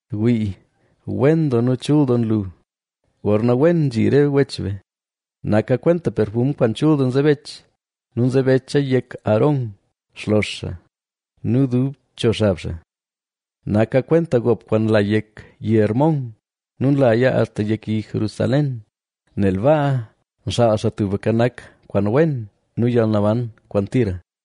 Wii, wen doo nu chul doo nlu, gorna wen nzhi re wech be. Naka kwenta perfum kwaan chul doo nzebech nu nzebecha yek Aarón, xlox xaa nu dub cho xab xaa. Naka kwenta gop kwaan nla yek yi Hermón nu nlaya axta yek yi Jerusalén, nel baa nxaal Xaa Tubka Nak kwaan wen nu yalnaban kwaan tira.